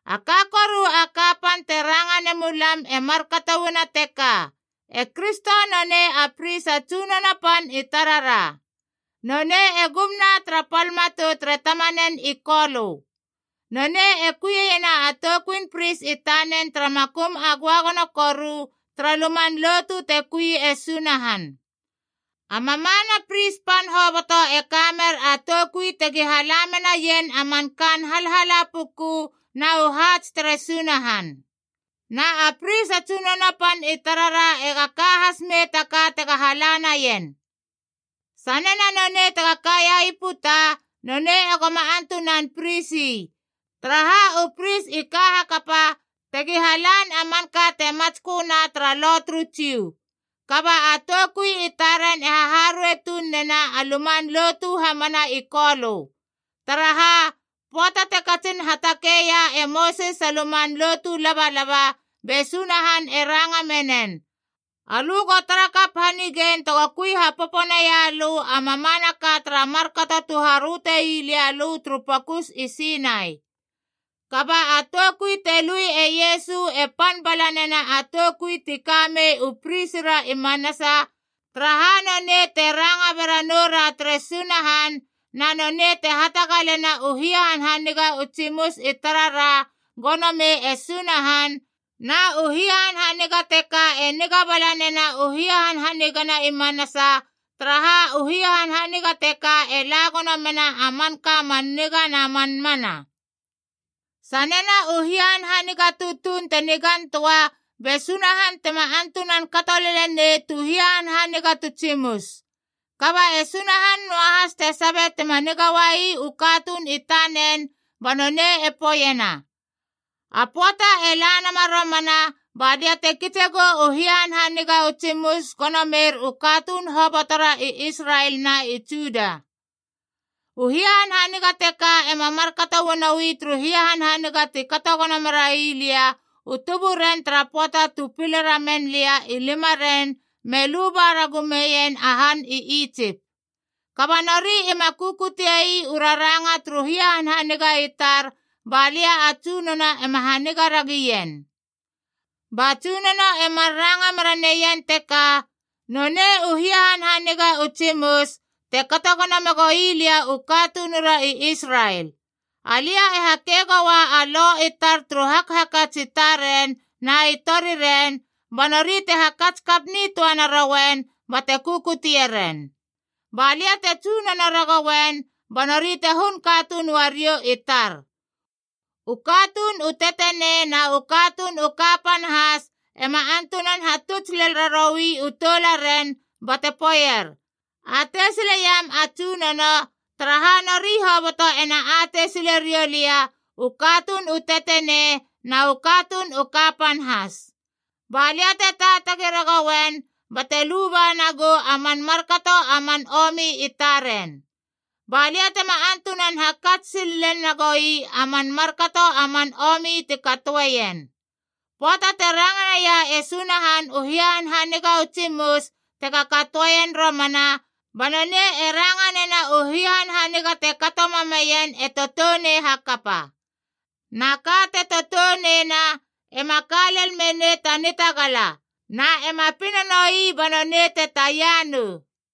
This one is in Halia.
A ka koru a kapan te ranga nemulam e markato uana teka: e Kristo nonei a pris a tsunono pan i tarara. Nonei e gumna tara pal matou tere Tamanen i Kolö. Nonei e kuieiena a toukuin Pris i tanen tara makum a göagono koru tara luman lotu te kui e Sunahan. A mamana pris pan hoboto e kamer a toukui tegi hala menaien a man kaan halhala puku na u haats tere Sunahan. Na a pris a tsunono pan i tarara ega ka has mei ta ka tega hala naien. Sanena nonei tega kaia i puta, nonei egoma antunan pris ii, taraha u pris i ka hakapa tegi halan a manka te matsköna tara Lo turu Jiu. Kaba a toukui i taren e haharuei tuun nena a luman lotu hamana i Kolö. Taraha, pöata te katsin hatakeia e Mosis a luman lotu labalaba, be Sunahan e ranga menen, “Alö go tara kap hanigein tego kui hapopo naia lö a mamanaka tara markato tu haröte ii lia lö turu pokus i Sinai.” Kaba a toukui te lui e Iesu e pan bala nena a toukui ti kamei u prisira i manasa, taraha nonei te ranga bera noura tere Sunahan, na nonei te hatagalena u hia hanhaniga u tsimus i tarara gono mei e Sunahan, na u hanhaniga teka e niga bala nena u hia hanhaniga na i manasa, taraha u hia hanhaniga teka e la gono menama a manka man niga na man mana. Sanena u hia hanhaniga tutuun te nigan töa be Sunahan tema antunan kato lelenei tu hia hanhaniga tu tsimus. Kaba e Sunahan noahas te sabe tima niga uai u katuun i tanen, ba nonei e poeiena: “A pöata e la nama romana balia te kitse gou u hanhaniga u tsimus gono mer u katuun hobotora i Israel na i Juda. U hia hanhaniga teka ema markato uanoi turu hanhaniga ti kato gono merai lia u tuburen tara pöata tu pile ramen lia i limaren me luba ragu meien a han i Itsip. Kaba nori ima kukutie ii u raranga turu hanhaniga i tar balia a Tsunono ema haniga ra gien.” Ba Tsunono e mar ranga mera neien teka, “Nonei u hia hanhaniga u tsimus te kato gono megoi lia u katunura i Israel. Alia e hakei goua a lo i tar turu hakhakats i taren na i tori ren, ba nori te hakats kap nitöa narouen bate kukutie ren. Ba lia te tsunono ragouen ba nori te hun katuun uariou i tar. U katuun u tetenei na u katuun u kapan has ema antunan hatuts lel raroui u toularen bate poeier, ‘Atei sileiam a Tsunono,’ taraha, nori hoboto ena atei sile riou lia, u katuun u tetenei na u katuun u kapan has. Ba lia te taatagi ragouen bate luba nagou a man markato a man omi i taren. Ba lia tema antunan hakats sil lel na goi a man markato a man omi ti katoeien.” Pöata te ranga naia e Sunahan u hia hanhaniga u tsimus tega katoeien romana, ba nonei e ranga nena u hia hanhaniga te kato mameien e toutounei hakapa. Na ka te toutouneina ema ka lel menei ta nitagala, na ema pina noi ba nonei te taia nou.